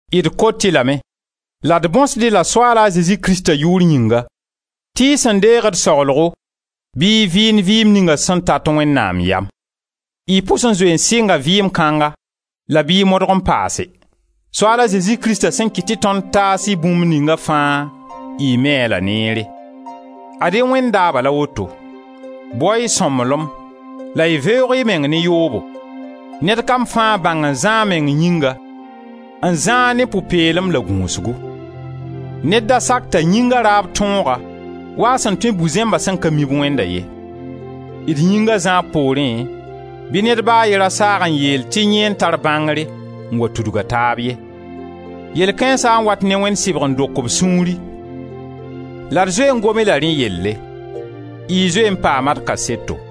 D kot-y lame la d bõsd-y-la Soaal a Zezi Krista yʋʋr yĩnga tɩ y sẽn deeg d saglgo, bɩ y vɩɩnd vɩɩm ninga sẽn tat Wẽnnaam yam. Y pʋs n zoe sɩnga vɩɩm kãnga, la bɩ y modg n paase. Soaal a Zezi Krista sẽn kɩt tɩ tõnd taas-y bũmb ninga fãa y mi-a la neere. Ad-y Wẽnd daaba la woto: bao-y sõmblem la y veoog y meng ne yoobo. Ned kam fãa bãng n zã a meng yĩnga, n zã-a ne pʋ-peelem la gũusgu. Ned da sak t'a yĩnga raab tõog-a wa a sẽn tõe bu-zẽmba sẽn ka mi-b Wẽnda ye. D yĩnga zãab poorẽ bɩ ned ba a ye ra saag n yeel tɩ yẽ n tar bãngre n wa tudg a taab ye. Yɛl kãensa n wat ne Wẽnd sɩbg n dok b sũuri, la d zoe n gom-y la rẽ yelle. Y zoe n paama d kaseto.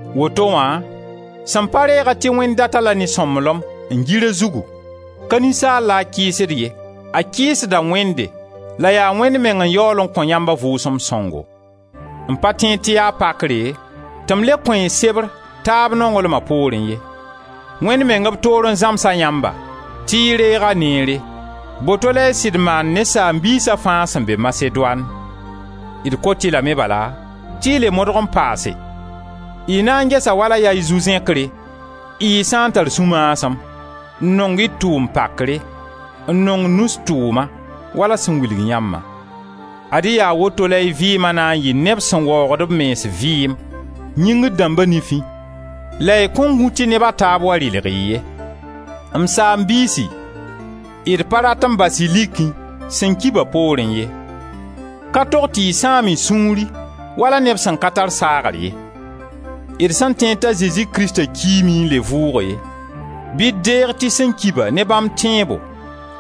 Woto wã, sẽn pa reega tɩ Wẽnd dat-a-la ne sõmblem, n gir a zugu, ka ninsaal la a kɩɩsd ye, a kɩɩsda Wẽnde la yaa Wẽnd meng n yaool n kõ yãmb a Vʋʋsem Sõngo. M pa tẽed tɩ yaa pakre tɩ m le kõ-y sebr taab nonglma poorẽ ye; Wẽnd meng b toore n zãms-a yãmba, tɩ y reeg-a neere. Boto la y sɩd maand ne saam-biisa fãa sẽn be Masedoan. D kot-y lame bala tɩ y le modg n paase. Y na n gesa wala yaa y zu-zẽkre y sã n tar sũ-maasem, n nong y tʋʋm pakre, n nong nus tʋʋma, wala sẽn wilg yãmbã. Ad-y yaa woto la y vɩɩma na n yɩ neb sẽn waoogd b mens vɩɩm, yĩngr dãmba nifẽ, la y kõn gũ tɩ neb a taab wa rɩlg-y ye. M saam-biisi, d pa rat n bas-y likẽ sẽn ki-ba poorẽ ye. Ka tog tɩ y sãam y sũuri wala neb sẽn ka tar saagr ye. D sẽn tẽed t'a Zezi Krista kiime n le vʋʋge, bɩ d deeg tɩ sẽn ki-ba ne bãmb tẽebo,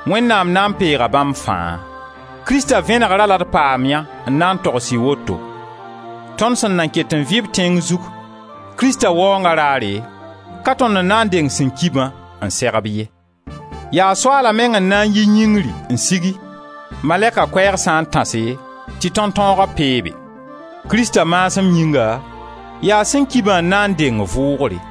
Wẽnnaam na n peega bãmb fãa. Krista vẽnegra la d pamyã n na n togs-y woto: tõnd sẽn nan ket n vɩ-b tẽng zug, Krista Waoonga raare, ka tõnd n na n deng sẽn ki-bã n seg-b ye. Yaa Soaala meng n na n yi yĩngri n sigi, malɛka koɛɛg sã n tãse tɩ tõntõoga peebe. Krista maasem yĩnga, yaa sẽn ki-bã n na n deng vʋʋgre.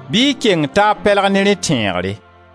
Bɩ y keng taab pɛlg ne rẽ tẽegre.